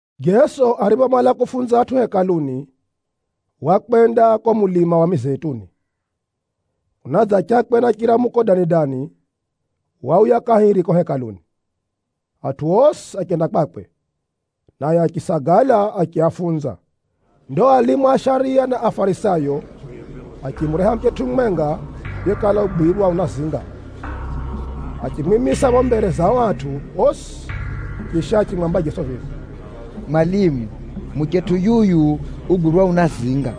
Jeso ariphomala kufunza atʼu Hekaluni, wakwenda ko mulima wa Mizeituni. Kunadzachakwe na chiramuko dani-dani, wauya kahiri ko Hekaluni. Atʼu osi achenda kwakwe, naye achisagala achiafunza. Ndo alimu a shariya na Afarisayo, achimureha muchetʼu mumwenga yekala ugwirwa unazinga. Achimwimisa pho mbere za atʼu osi, chisha achimwamba Jeso vivi, “Mwalimu! Muchetʼu yuyu ugwirwa unazinga.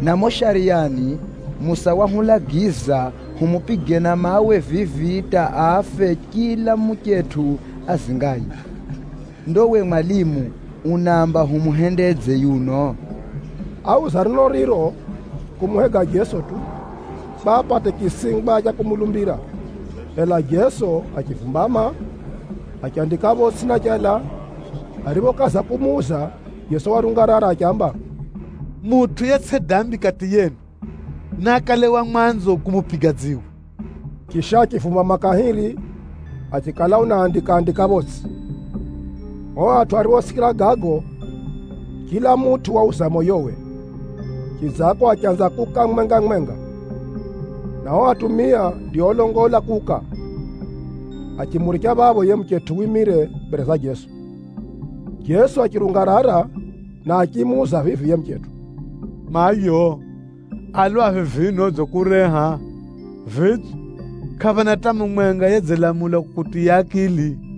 Na mumo Shariyani, Musa wahulagiza humupige na mawe vivi hata afe chila muchetʼu azingaye. Ndo we mwalimu, unaamba humuhendedze yuno?” Áuza neno riro kumuhega Jeso tu, kwa apate chisingwa cha kumulumbira. Ela Jeso achivumbama, achandika photsʼi na chala. Ariphokaza kumuuza, Jeso warungarara achiamba, “Mutʼu yetsʼi dambi kati yenu, naakale wa mwanzo kumupiga dziwe.” Chisha achivumbama kahiri, achikala unaandika-andika photsʼi. O atʼu ariphosikira gago, chila mutʼu wauza moyowe, chidzako achanza kuuka mumwenga-mumwenga, na o atumia ndio olongola kuuka. Achimuricha phapho yiye muchetʼu wimire mbere za Jeso. Jeso achirungarara, na achimuuza vivi yiye muchetʼu, “Mayo, a lwaphi vino odzikureha? Vidze, kʼaphana hata mumwenga yedzilamula kukutiya akili?”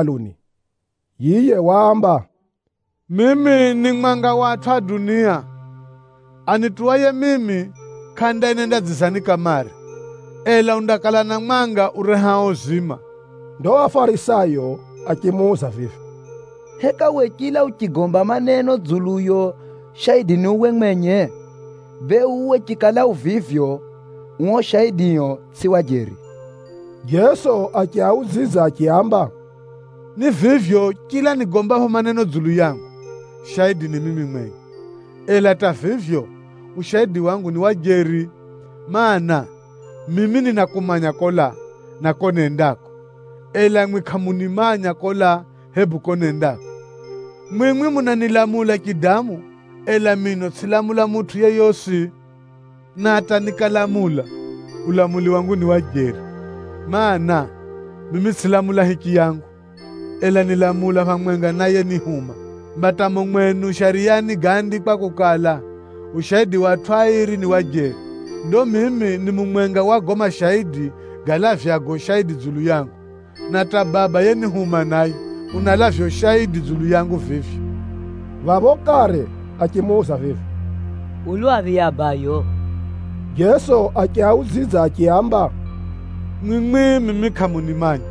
Jeso waenderera kufunza atʼu mumo Hekaluni. Yiye waamba, “Mimi ni mwanga wa atʼu a dunia. Anituwaye mimi kʼandaenenda dzizani kamare, ela undakala na mwanga urehao uzima.” Ndo Afarisayo achimuuza vivi, “Heka we chila uchigomba maneno dzuluyo, shaidi ni uwe mwenye? Bee uwe chikala u vivyo, uo ushaidio tsʼi wa jeri.” Jeso achiaudzidza achiaamba, “Ni vivyo chila nigombapho maneno dzulu yangu, shaidi ni mimi mwenye. Ela hata vivyo, ushaidi wangu ni wa jeri, mana, mimi ninakumanya kolaa, na ko nendako. Ela mwi kʼamunimanya kolaa, hebu ko nendako. Mwimwi munanilamula chidamu, ela mino tsʼilamula mutʼu yeyosi. Na hata nikalamula, ulamuli wangu ni wa jeri, mana, mimi tsʼilamula hichiyangu, ela nilamula phamwenga na yenihuma. Mba hata mumo mwenu Shariyani gáandikwa kukala, ushaidi wa atʼu airi ni wa jeri. Ndo mimi ni mumwenga wa gago mashaidi galavyago ushaidi dzulu yangu, na hata Baba yenihuma naye, unalavya ushaidi dzulu yangu vivyo.” Phapho kare achimuuza vivi, “U lwaphi yiye abayo?” Jeso achiaudzidza achiaamba, “Mwimwi mimi kʼamunimanya,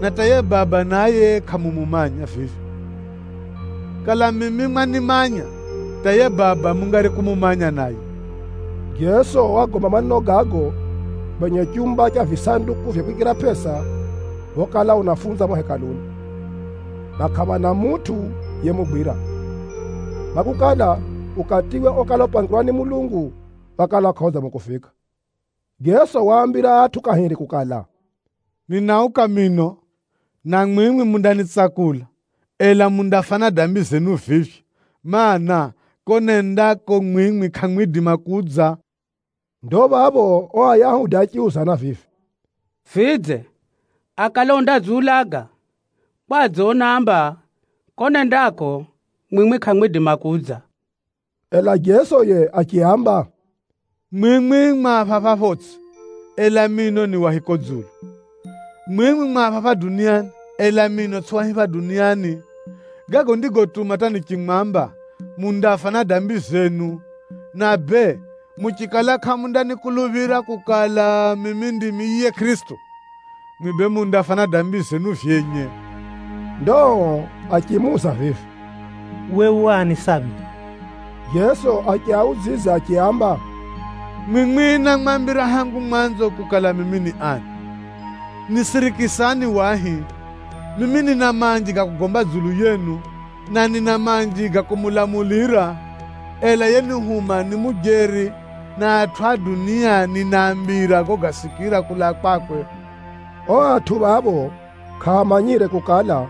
na hata yiye Baba naye kʼamumumanya vivyo. Kala mimi mwanimanya, hata yiye Baba mungari kumumanya naye.” Jeso wagomba maneno gago kwenye chumba cha visanduku vya kwikira pʼesa phokala unafunza mumo Hekaluni. Na kʼaphana mutʼu yemugwira, kwakukala, ukatiwe okala upangirwa ni Mulungu wakala kʼaudzangwe kufika. Jeso waambira atʼu kahiri kukala, “Ninauka mino, na mwimwi mundanitsakula, ela mundafa na dambi zenu vivyo, mana, kuko nendako mwimwi kʼamwidima kudza.” Ndo phapho ao Ayahudi achiuzana vivi, “Vidze, akale undadziulaga? Kwadze unaamba, ‘Kuko nendako mwimwi kʼamwidima kudza’?” Ela Jeso yiye achiaamba, “Mwimwi mwa phapha photsʼi, ela mino ni wa hiko dzulu. Mwimwi mwa phapha duniani, ela mino tsʼimi wa hipha duniani. Gago ndigotuma hata nichimwamba, mundafa na dambi zenu. Na bee muchikala kʼamundanikuluphira kukala, mimi ndimi yiye Kʼirisito, mwimwi bee mundafa na dambi zenu vyenye.” Ndo ao achimuuza vivi, “Uwe u ani sambi?” Jeso achiaudzidza achiaamba, “Mwimwi námwambira hangu mwanzo kukala mimi ni ani! Nisirikisani wahi, mimi nina manji ga kugomba dzulu yenu, na nina manji ga kumulamulira, ela yenihuma ni mujeri, na atʼu a dunia ninaambira gogasikira kulaa kwakwe.” Ao phapho kʼaamanyire kukala,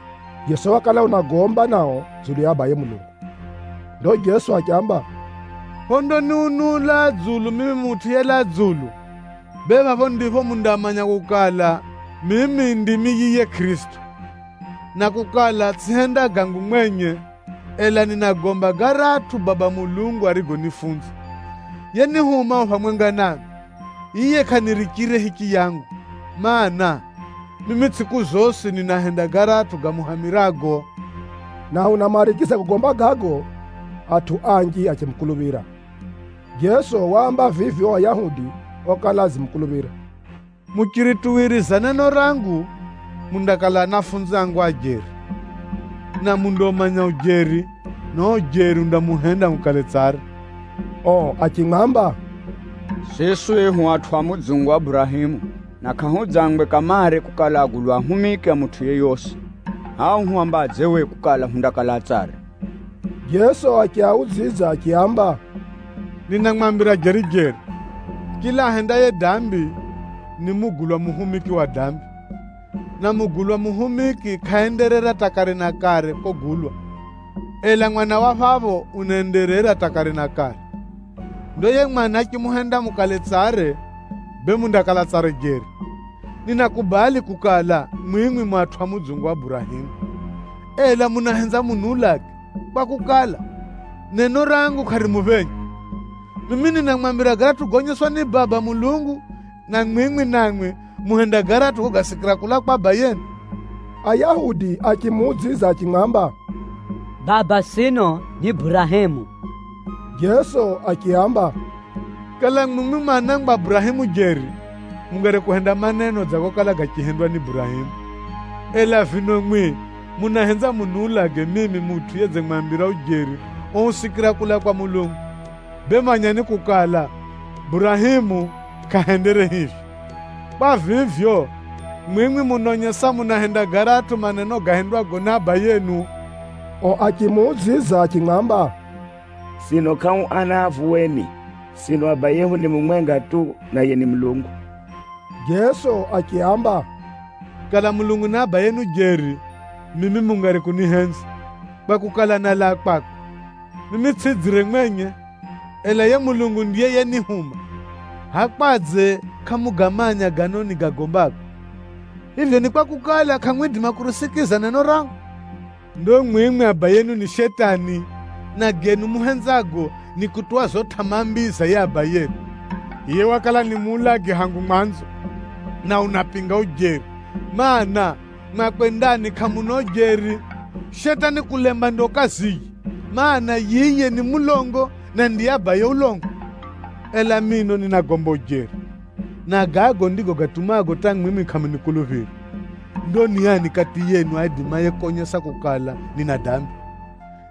Jeso wakala unagomba nao dzulu ya Abaye Mulungu. Ndo Jeso achiamba, “Phondaniunula dzulu mimi Mutʼu yelaa dzulu, bee phapho ndipho mundamanya kukala, mimi ndimi yiye Kʼirisito, na kukala tsʼihenda gangu mwenye, ela ninagomba garatʼu Baba Mulungu arigonifunza. Yenihuma u phamwenga nami: yiye kʼanirichire hichiyangu, mana, mimi tsʼiku zosi ninahenda garatʼu gamuhamirago.” Na unamarigiza kugomba gago, atʼu anji achimukuluphira. Jeso waamba vivi ao Ayahudi okala adzimukuluphira, “Muchirituwiriza neno rangu, mundakala anafunzi angu a jeri. Na mundaumanya ujeri, na uo ujeri undamuhenda mukale tsare.” Ao achimwamba, “Siswi hu atʼu a mudzungu wa Burahemu, na kʼahudzangwe kamare kukala agulwa ahumiki a mutʼu yeyosi. Hʼa uhwambadze we kukala, hundakala tsare?” Jeso achiaudzidza achiaamba, “Ninamwambira jeri-jeri, chila ahendaye dambi, ni mugulwa muhumiki wa dambi. Na mugulwa muhumiki kʼaenderera hata kare na kare kogulwa, ela mwana wa phapho unaenderera hata kare na kare. Ndo yiye Mwana achimuhenda mukale tsare, bee mundakala tsare jeri. Ninakubali kukala, mwimwi mu atʼu a mudzungu wa Burahemu! Ela munahenza muniulage kwakukala, neno rangu kʼarimuphenya. Mimi ninamwambira garatʼu goonyeswa ni Baba Mulungu, na mwimwi namwi muhenda garatʼu gogasikira kulaa kwa abayenu.” Ayahudi achimuudzidza achimwamba, “Baba sino ni Burahemu!” Jeso achiaamba, “Kala mwimwi mu anangwa a Burahemu jeri, mungari kuhenda maneno dza gokala gachihendwa ni Burahemu. Ela vino mwi munahenza muniulage mimi mutʼu yedzimwambira ujeri ousikira kulaa kwa Mulungu. Bee manyani kukala, Burahemu kʼahendere hivyo. Kwa vivyo, mwimwi munaonyesa munahenda garatʼu maneno gahendwago ni abayenu.” Ao achimuudzidza achimwamba, “Sino kʼahu ana a vuweni! Sino abayehu ni mumwenga tu, naye ni Mulungu.” Jeso achiaamba, “Kala Mulungu ni abayenu jeri, mimi mungari kunihenza, kwakukala, nálaa kwakwe. Mimi tsʼidzire mwenye, ela yiye Mulungu ndiye yenihuma. Hʼaya kwadze kʼamugamanya gano nimwambirago? Ni kwakukala kʼamwenzi kusikira maneno gangu. Ndo mwimwi abayenu ni Shetani, na genu muhenzago ni kutuwa zo tʼamaa mbii za yiye abayenu. Yiye wakala ni muulagi hangu mwanzo, na unapinga ujeri, mana, mwakwe ndani kʼamuna ujeri. Shetani kulemba ndiyo kaziye, mana, yiye ni mulongo, na ndiye abaye ulongo. Ela mino ninagomba ujeri, na gago ndigo gatumago hata mwimwi kʼamunikuluphira! Ndo ni ani kati yenu aidimaye konyesa kukala, nina dambi?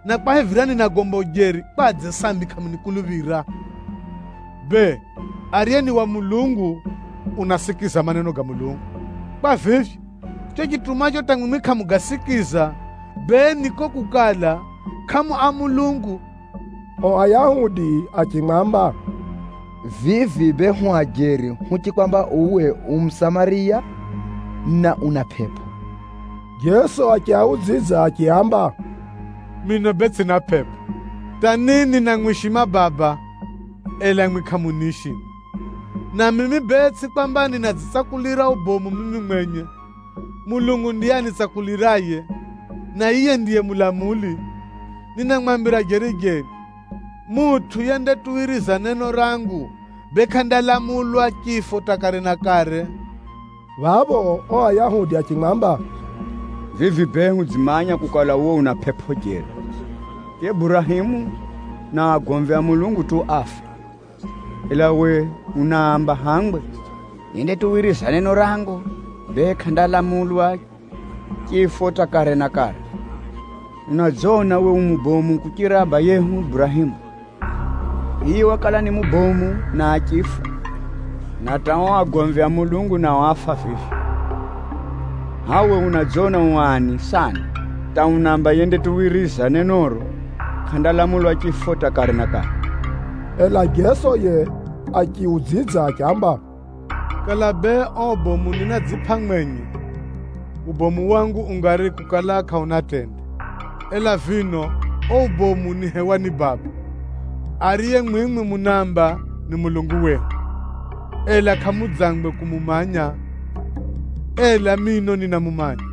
Na kwahivira ninagomba ujeri, kwadze sambi kʼamunikuluphira? Bee, ariye ni wa Mulungu, unasikiza maneno ga Mulungu. Kwa vivyo, chicho chitumacho hata mwimwi kʼamugasikiza, bee ni kuko kukala, kʼamu a Mulungu.” Ao Ayahudi achimwamba, “Vivi bee hu ajeri huchikwamba uwe u Musamariya, na una pʼepʼo!” Jeso achiaudzidza achiaamba, “Mino bee tsʼina pʼepʼo, hata ni ninamwishima Baba, ela mwimwi kʼamuniishima. Na mimi bee tsʼi kwamba ninadzitsakulira ubomu mimi mwenye. Mulungu ndiye anitsakuliraye, na yiye ndiye mulamuli. Ninamwambira jeri-jeri, mutʼu yendatuwiriza neno rangu, bee kʼandalamulwa chifo hata kare na kare.” Phapho ao Ayahudi achimwamba, “Vivi bee, hudzimanya kukala, uwe una pʼepʼo jeri! Yiye Burahemu na agomvi a Mulungu tu áfa, ela we unaamba hangwe, ‘Yendatuwiriza neno rangu, bee kʼandalamulwa chifo hata kare na kare!’ Unadzona uwe u mubomu kuchira abayehu Burahemu? Yiye wakala ni mubomu na achifa, na hata ao agomvi a Mulungu nao áfa vivyo. Hʼaya uwe unadzona u ani sana hata unaamba yendatuwiriza nenoro, kʼandalamulwa chifo hata kare na kare?” Ela Jeso yiye achiudzidza achiamba, “Kala bee ao ubomu ninadzipʼa mwenye, ubomu wangu ungari kukala kʼauna tende. Ela vino uo ubomu nihewa ni Baba, ariye mwimwi munaamba, ‘Ni Mulungu wehu,’ ela kʼamudzangwe kumumanya. Ela mino ninamumanya,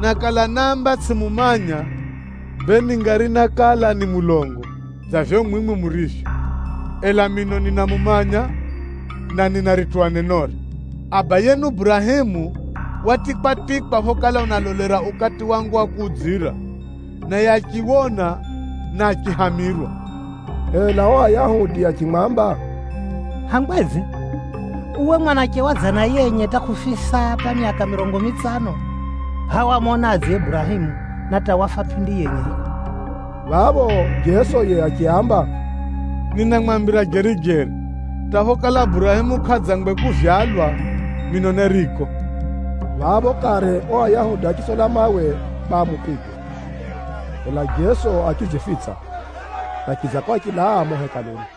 na kala náamba tsʼimumanya, bee ningari nákala ni mulongo dza vivyo mwimwi murivyo. Ela mino ninamumanya, na ninarituwa nenore. Abayenu Burahemu watikwatikwa phokala unalolera ukati wangu wa kudzira, naye achiwona, na achihamirwa.” Ela ao Ayahudi achimwamba, “Hangwedze? Uwe mwanache wa dzana yenye hata kʼufisa hata myaka mirongo mitsano, hʼaya wamonadze Burahemu na hata wafa pʼindi yenye hiko?” Phapho Jeso yiye achiaamba, “Ninamwambira jeri-jeri, hata phokala Burahemu kʼadzangwe kuvyalwa, mino neriko.” Phapho kare ao Ayahudi achitsola mawe kwa amupige, ela Jeso achidzifitsa, na chidzako achilaa mumo Hekaluni.